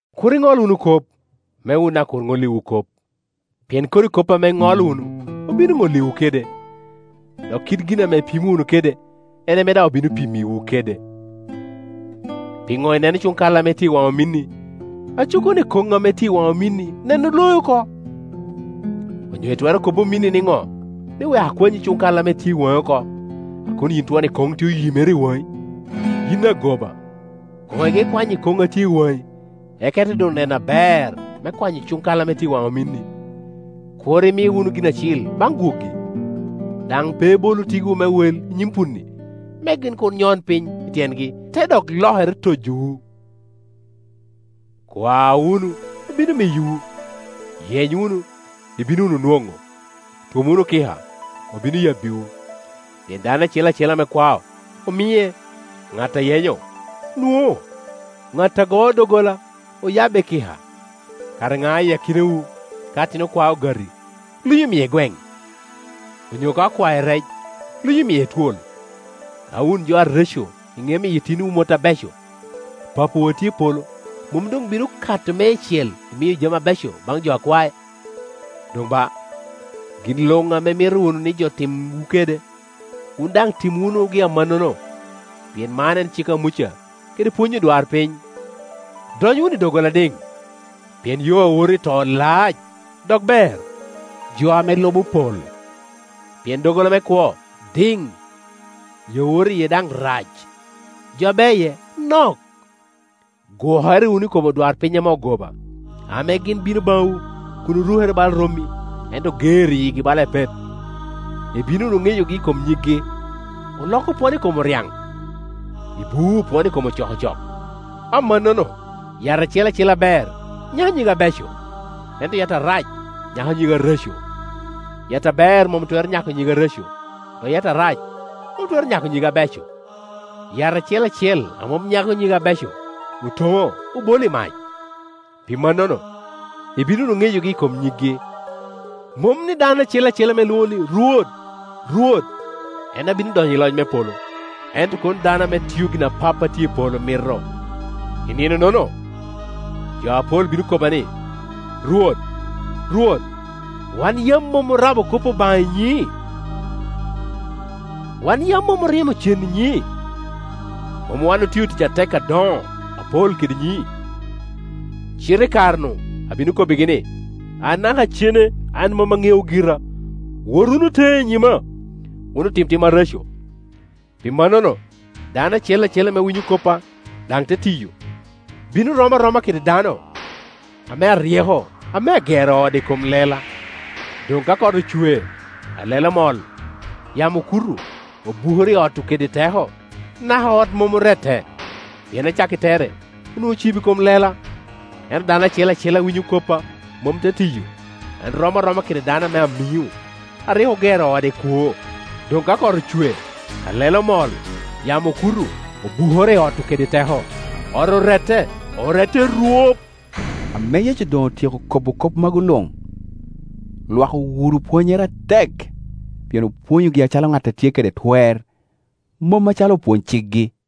“Kur iŋol wunu kop, me wun daŋ kur ŋolliwu kop; pien kodi kop ame iŋolo wunu obino ŋolliwu kede, dok kit gin ame ipimo wunu kede, en ame daŋ obino pimmiwu kede. Piŋo ineno cuŋ kal ame tye i waŋ ominni, aco kono ikoŋ a tye i waŋi ikomi neno loi oko? Onyo itwero kobo ominni niŋo ni, ‘Wek akwany cuŋ kal a tye i waŋi oko’, a kun yin twon ikoŋ tye oyimere i waŋi? Yin agoba, koŋ ige kwanyo ikoŋ a tye i waŋi, eka ite doŋ neno aber me kwanyo cuŋ kal a tye i waŋ ominni. “Kur imi wunu gin acil baŋ gwogi, daŋ pe ibolu tiggiwu me wel i nyim punni, me gin kur nyon piny i tyengi, te dok lokere, tojowu. “Kwa wunu, obino miyowu; yeny wunu, ibino wunu nwoŋo; twom wunu kika, obino yabbiwu. Pien dano acel acel ame kwao, omie, ŋat a yenyo, nwoŋo; ŋat a goo doggola oyabbe kika. Kara ŋa i akinawu, ka atin okwae ogati, lunyo miye gweŋ? Onyo ka okwae rec lunyo miye twol? Ka wun jo areco iŋeo miyo itinowu mot abeco, Papawu a tye i polo mom doŋ bino kato meicel imiyo jami abeco baŋ jo a kwae? Doŋ ba, gin luŋ ame imito wunu ni jo timwu kede, wun daŋ tim wunugi amannono, pien man en cik a Muca kede pwony odwarpiny. “Dony wunu i doggola adiŋ, pien yo a woto i to lac, dok ber, jo ame lubo pol. Pien doggola me kwo diŋ, yo a woto iye daŋ rac, jo a bea iye nok. “Gwokere wunu i kom odwarpiny ame ogoba, ame gin bino baŋwu kun orukere bala rommi, ento oger i yigi bala epet. Ibino wunu ŋeyogi i kom nyiggi. Olok opwono i kom oryaŋ? Ibuu opwono i kom ocokocok? Amannono yat acel acel aber nyako nyige abeco, ento yat arac nyako nyige areco. Yat aber mom twero nyako nyige areco, dok yat arac mom twero nyako nyige abeco. Yat acel acel a mom nyako nyige abeco, otoŋo, obolo i mac. Pi mannono ibino wunu ŋeyogi i kom nyiggi. “Mom ni dano acel acel ame lwoŋa ni, ‘Rwot, Rwot,’ en a bino donyo i loc me polo, ento kono dano ame tio gin a Pappa a tye i polo mito. I nino-nono jo apol bino kobba ni, ‘Rwot, Rwot, wan yam mom orabo kop Obaŋa i nyiŋi? Wan yam mom oryemo cen i nyiŋi? Mom wan otio tic atek adoŋo apol kede nyiŋi?’ Cite i kare-nu abino kobbigi ni, ‘Anaka cene an mom aŋeowu gira. Wot wunu teŋe i nyima, wun otim tim areco!’ “Pi mannono, dano acel acel ame winyo koppa, daŋ te tiyo, bino rom aroma kede dano ame aryeko, ame agero ode i kom lela. Doŋ ka kot ocwe, alele omol, yamo okuto, obukoro i ot-tu kede teko, naka ot mom orette, pien acakki tere onwoŋo ocibo i kom lela. Ento dano acel acel a winyo koppa, mom te tiyo, en rom aroma kede dano ame amiŋo, a rik ogero ode i kwoo. Doŋ ka kot ocwe, alele omol, yamo okuto, obukoro i ot-tu kede teko, ot orette, orette orwop.” Ame Yecu doŋ otyeko kobo kop magu luŋ, lwak owuro pwonnyere atek, pien opwonyogi acalo ŋat a tye kede twer, mom acalo opwony-cikgi.